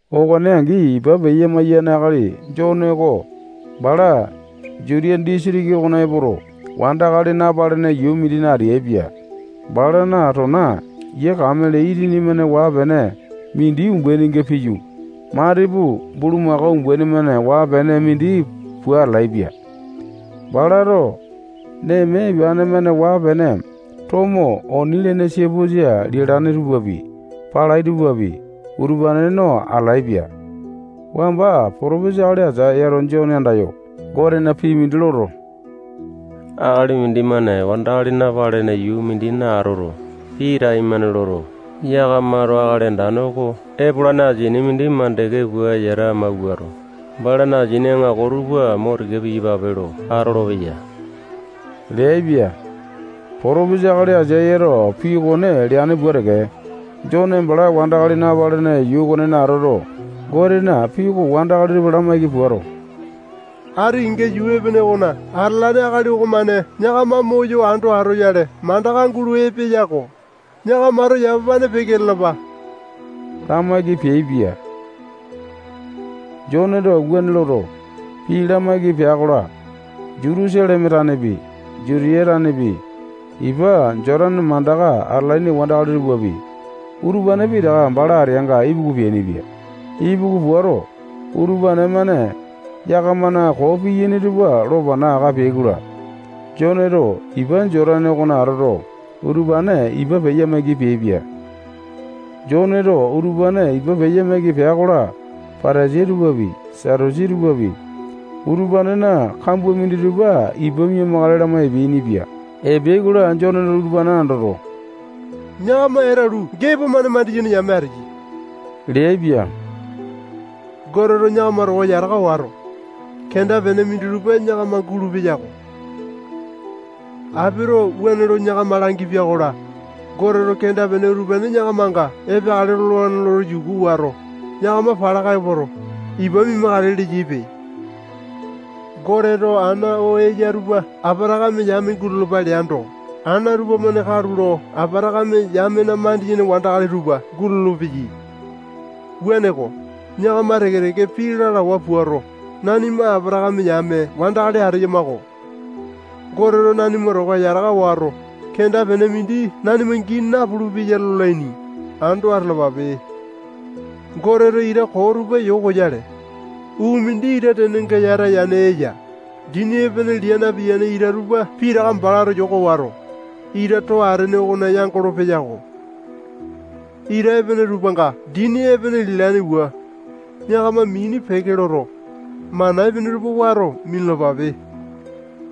Okone angi, ipa peya-maiyane akali Jone oko bala Jutiya disitiki okona epoto, wandakali napalene yuu mindina ateaipia. Balana tona yia kamele itini-mane waa-pene mindi umbaininga piyu, matipu bulumako umbaini-mane waa-pene mindi pua atalaepia. Balato neme ipane-mane waa-pene tomo oni lene siapusa lialane tupapi, palai tupapi, utupane no atalaepia. Wamba potopesa akali Aisayato Jone andayo, Gotena pii mindi loto, akali mindimane wandakali napalene yuu mindina atoto, pii taimane loto, yakamato Akali Andane oko epolane asini mindi mandeke pua yata mawuato, balana asini aŋako tupa mo tika piyapape lo atolopeya leaipia. Potopesa akali Aisayato pii okone leane pua teke, Jone bala wandakali napalene yuu okonena atoto, Gotena pii oko wandakali tupa lamaiki puato, ati kenga yuu epene okona atalane akali okomane yakama moyo ando atoyale mandaka gulo epeya-ko. Yakamato yamapane peke lalapa lamaiki peaipia. Joneto wuane loto, pii lamaiki pea-kola, Jutusaleme tanepi, Jutiya tanepi, ipa Jotane mandaka atalaini wandakali tupapi, utupane pitaka bala ateanga ipuku peainipia. Ipuku puato, utupane-mane yakamana koo piyaini tupa lo pana aka peai-kola, Joneto ipa Jotane okona atoto, utupane ipa peya-maiki peaipia. Joneto utupane ipa peya maiki pea-kola, Patasai tupapi, Satusi tupapi, utupanena kambua minditupa ipa mia-makale lama epeainipia. Epeai-kola, Joneto utupa andoto, yakama etulu gepo-mane mandiyene yame ateyai leaipia. Goteto yakama towa yataka wato, kenda-pene minditupa yakama gulupeya-ko. Apito wuane lo yakama langipia-kola, Goteto kenda-pene utupane yakamanga epeakale lolane lo yuku wato, yakama palaka epoto, ipa mia-makale leyaipe. Goteto ana oo eya utupa Apatakame yame gulalapa leando, ana utupa-mane katulo Apatakame yamena mandiyene wandakali tupa gulolo-peyai. Wuaneko, yakama teke-teke pii lalawa puato, nanima Apatakame yame wandakali ateyama-ko. Goteto nanima towa yataka wato, kenda-pene mindi nanima gii napulu-peya lolaini, ando atalapape. Goteto ita koo tupa yokoyale, uu mindi ita tenenga yata yane eya. Dini epene lia napiyane ita tupa pitaka balato yoko wato, ita too atene okona yangolo-peyako. Ita epene tupanga dini epene lialaini pua, yakama mini peke loto, mana epene tupa wato minalapape.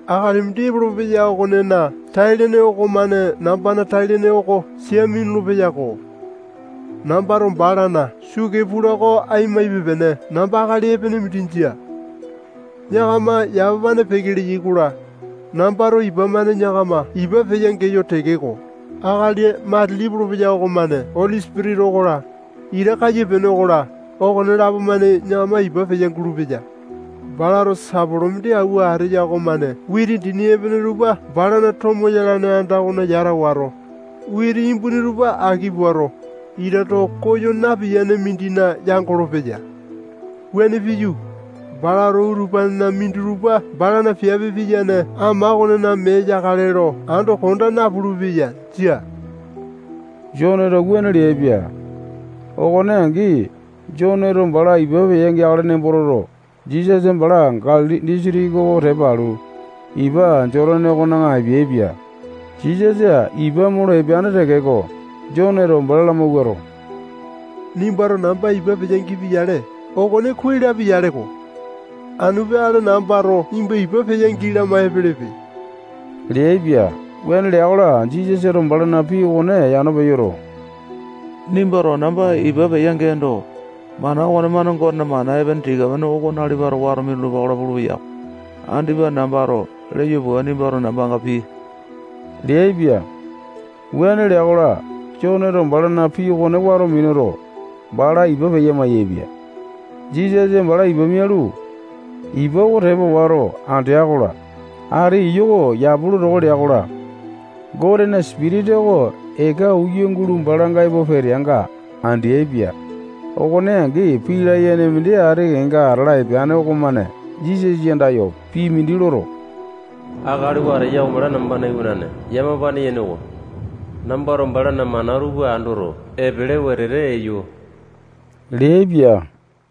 Akali mindi epolopeya okonena tai-lene okomane nambana tai-lene oko sia minulu-peyako. Nambato balana sukee pula oko ai maipe-pene namba akali epene mindi jia. Yakama yamapane peke leyai-kola, nambato ipa-mane yakama ipa peya-geyo tekeko, akali matili epolopeya okomane Oli Sipitisa okola, ita kaiyapiane okola, okonelapo-mane yakama ipa peya-gulupeya. Balato sapolo mindi awua ateya okomane witi dini epene tupa balana tomo yalane anda okona yata wato, witi imbuni tupa aki puato, ita too koyo napiyane mindina yangolo-peya. Wuane piyu, balato utupanena minditupa balana piape piyane ama okonena mee yakale lo ando konda napulu-peya. Jia. Joneto wuane leaipia. Okone angi, Joneto bala ipa peya-geakale nembo toto, Jisasa bala Galili disitiki oko tepa alu, ipa Jotane okona epeaipia. Jisasa ipa molo epeane tekeko, Joneto bala lamawuato, nimbato namba ipa peya gipi-yale, okone kuai lapia-yaleko. Anu peakale nambato nimba ipa peya-gii lama epelepe leaipia. Wuane lea-kola, Jisasato balana pii okone yano peyoto, nimbato namba ipa peya-geendo, mana okonemane Gotena mana epene tika-pene oko nalipato wato minulupa-kola pulu-peyako. Andipa nambato leyo pua nimbato nambanga pii leaipia. Wuane lea-kola, Joneto balana pii okone wato minuto, bala ipa peya-maiyaepia. Jisasa bala ipa mialu, ipa oko tepa wato, andea-kola, ati iyu oko yapu lo toko lea-kola, Gotena Sipitisa oko eka uya gulo balanga epo peteanga andeaipia. Okone angi, pii layene mindi ati kenga atala epeane okomane Jisasa andayo pii mindi loto, akali oo ateya oko bala nambana iwanane yamapane yene oko. Nambato balana mana tupa andoto, epele wetete eyo leaipia.